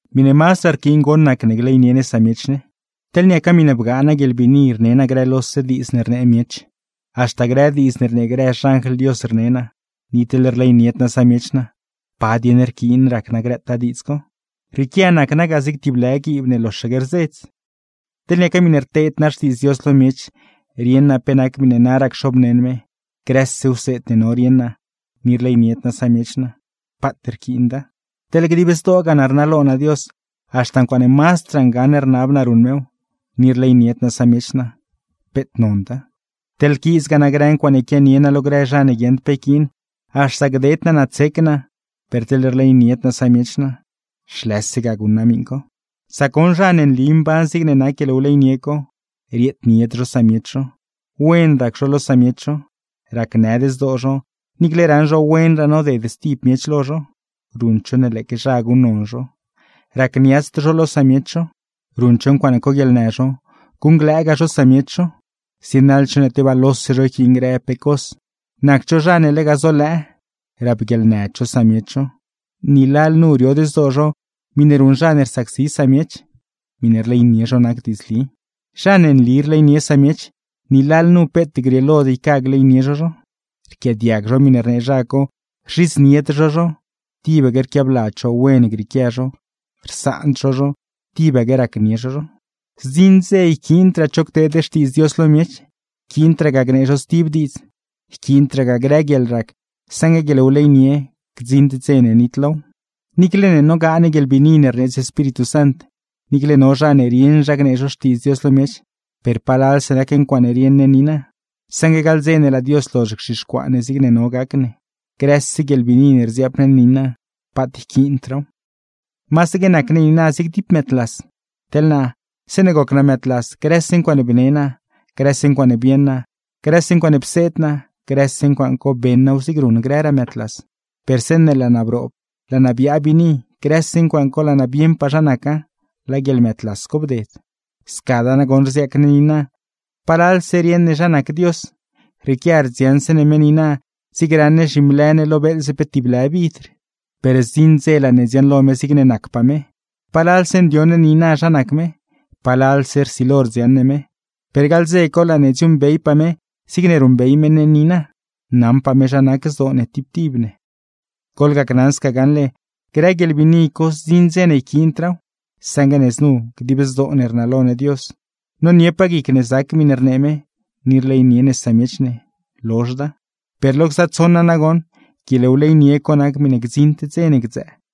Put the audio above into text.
Miṉe mazdraa rquiin goṉ nac ne gleynie ne samiech ne. Teḻ niaca miṉe bgaa naa guieḻbiini rne naa grë lose diidz ne rnee miech, haxta grë diidz ne rnee xanjl Dios rne naa, ni teḻ rleynied naa samiech naa, ¿pa dieṉ rquiin rac naa grëtaa diidz co? Rrieequia nac naa ga zig tib lë guiib ne loxaque rzedz. Teḻ niaca miṉe rteed naa xtiidz Dios lo miech, rieṉ naa pe nac miṉe naraa cxobneṉ me, grëse wseed ne no rieṉ naa, ni rleynied naa samiech naa, ¡paat rquiinda! Teḻ dib zdoogaa naa rnalo naa Dios, haxta ncuaaṉe mazdraa ngaṉ rnab naa ruṉ mew, ni rleynied naa samiech naa, ¡peet nonda! Teḻ quiizgaa naa grë ncuaaṉe quianie naa lo grë zha ne guieṉd pe yquiin, haxta gded naa naa tsec naa, per teḻ rleynied naa samiech naa, ¡zhlëse ga guṉ naa miṉ co! Sac goṉ zha ne nli mban zigne nac guieḻwleynie co: rieednied zho samiech zho, wen rac zho lo samiech zho, racnëd zdoo zho, niicle raṉ zho wenraa noded stib miech lo zho, ruṉd zho ne lëëque zha guṉnon zho, racniatsd zho lo samiech zho, ruṉd zho ncuaaṉe coguieḻnë zho, guṉglëëgaa zho samiech zho, zienaḻd zho ne tebaa lose zho yquiin grë pe cos, nacd zho zha ne lega zolëë, rapguieḻnëd zho samiech zho, ni lalnu riod zdoo zho miṉe ruṉ zha ne rsacsi samiech, miṉe rleynie zho nac diidzli. Zha ne nli rleynie samiech, ni lalnu peet grieelod yca gleynie zho zho; rquiaadiag zho miṉe rnee zha co, rzhidznied zho zho; tibaque rquiabladz zho wen grieequia zho, rsaand zho zho, tibaque racnie zho zho. Zdziṉ dze yquiindraa cho cteed xtiidz Dios lo miech, yquiindraa gnee zho stib diidz, yquiindraa grë guieḻrac, saṉgue guieḻwleynie gdziṉd dze ne nitlow. Niicle ne nogaa ne guieḻbiini ne rneedz Espíritu Sant, niicle no zha ne rieṉ zha gnee zho Xtiidz Dios lo miech, per palalse nac ncuaaṉe rieṉ ne niina. Saṉgue gaḻ dze ne laa Dios lozh gzhixcuaa ne zigne no gac ne, grëse guieḻbiini ne rdziaap ne niina, paat yquiindraaw. Masaque nac ne niina zig tib mëëdlas. Teḻ naa, zeeṉe goc naa mëëdlas grëse ncuaaṉe bne naa, grëse ncuaaṉe bieṉ naa, grëse ncuaaṉe pseed naa, grëse ncuaaṉ co beṉ naaw zigne ruṉ grëraa mëëdlas. Per zeeṉe laa naa broob, laa naa biaa biini, grëse ncuaaṉ co laa naa bieṉpaa zha naca; laa guieḻmëëdlas co bded. Scadaa nagoṉ rziaac ne niina, palalse rieṉ ne zha nac Dios, rrieequia rdziaṉse ne me niina zigne raṉ ne zhimlë ne lo beeḻze pe tib lë vidr; per zdziṉ dze laa ne dziaṉlo me zigne nacpaa me. Palalse ndioṉ ne niina zha nac me, palalse rsilo rdziaṉ ne me, per gaḻ dze co laa ne dziuuṉbeypaa me zigne ruṉbey me ne niina, naṉpaa me zha nac zdoo ne tib tib ne. Goḻgacnaṉ sca gaṉle, grë guieḻbiini co zdziṉ dze ne yquiindraaw, saṉgue ne znu: dib zdoo ne rnalo ne Dios, noniepaa guic ne zac miṉe rnee me, ni rleynie ne samiech ne, lozhda. Per lo gza tsoṉa nagoṉ, guieḻwleynie co nac miṉe gdziṉd dze ne gdzëë.